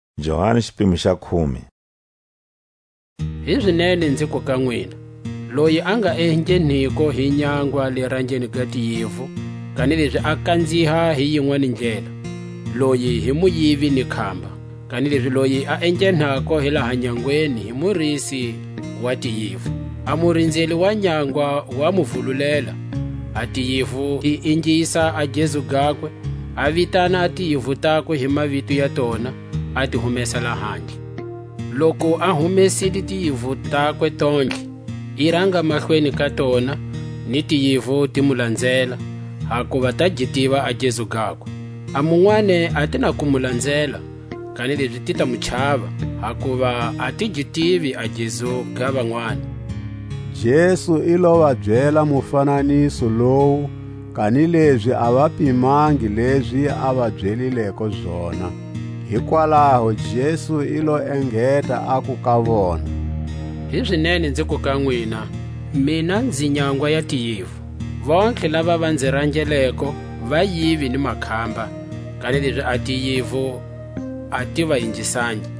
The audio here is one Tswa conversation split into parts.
A ranga ga tiyivu. Hizinene nziku ka nwina: Loyi a nga engheniko hi nyangwa le rangeni ga tiyivu, kanilezi a kanziha hi yinwani ndlela, loyi hi muyivi ni khamba. Kanilezi loyi a enghenako hi laha nyangweni hi murisi wa tiyivu. A murinzeli wa nyangwa wa mu vululela; a tiyivu ti ingisa a gezu gakwe; a vitana a tiyivu takwe hi mavito ya tona, a ti humesa lahandle. Loku a humesile tiyivu takwe tontlhe, i ranga mahlweni ka tona, ni tiyivu ti mu lanzela, hakuva ta gi tiva a gezu gakwe. A munwani a ti na ku mu lanzela, kanilezi ti ta mu chava; hakuva a ti gi tivi a gezu ga vanwani. Jesu i lo va byela mufananiso lowu, kanilezi a va pimangi lezi a va byelileko zona. Hikwalaho Jesu i lo engeta aku ka vona: Hizinene nziku ka nwina: Mina nzi nyangwa ya tiyivu. Vontlhe lava va nzi rangeleko vayivi ni makhamba; kanilezi a tiyivu a ti va ingisangi.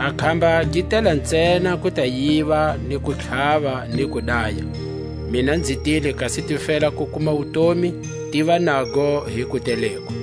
A khamba gi tela ntsena ku ta yiva, ni ku tlhava, ni ku daya. Mina nzi tile kasi ti fela ku kuma wutomi, tiva nago hi kuteleko.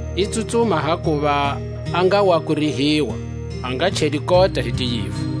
I tsutsuma hakuva a nga wa kurihiwa, a nga cheli kota hi tiyivu.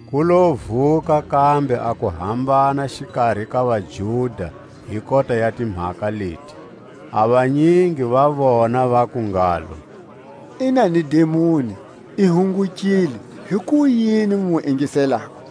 Ku lo vuka kambe a kuhambana xikari ka vaJuda hi kota ya timhaka leti. A vanyingi va vona vaku ngalo: I na ni dimoni, i hungukile; hikuyini mu mu ingiselako?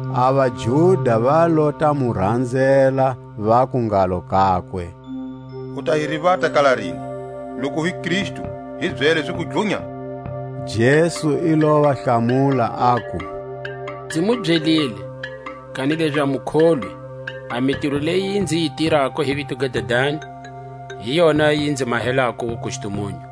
A vaJuda va lo ta mu ranzela, vaku ngalo kakwe: U ta hi rivata kala rini? Loku u hi Kristu, hi byele ziku dlunya, Jesu i lo va hlamula, aku: Nzi mu byelile, kanilezi a mu kholwi; a mitiro leyi nzi yi tirako hi vito ga Dadani, hi yona yi nzi mahelako wukustumunyu,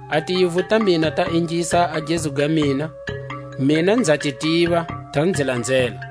A tiyivu ta mina ta ingisa a gezu ga mina; mina nza ti tiva, ta nzi lanzela.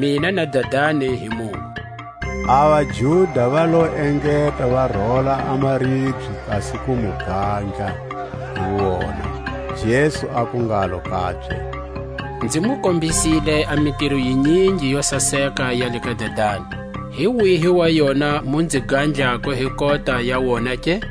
Mina na Dadani hi munwe. A vaJuda va lo engeta va rola a maribye kasi ku mu gandla hi wona. Jesu aku ngalo kabye: Nzi mu kombisile a mitiro yinyingi yo saseka ya le ka Dadani; hi wihi wa yona mu nzi gandlako hi kota ya wona ke?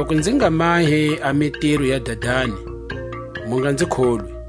Loku nzi nga mahi a mitiro ya Dadani, mu nga nzi kholwi;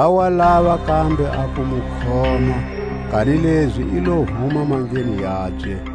Va wa lava kambe a ku mu khoma; kanilezi i lo huma mandleni yabye.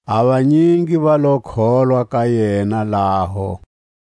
A vanyingi va lo kholwa ka yena laho.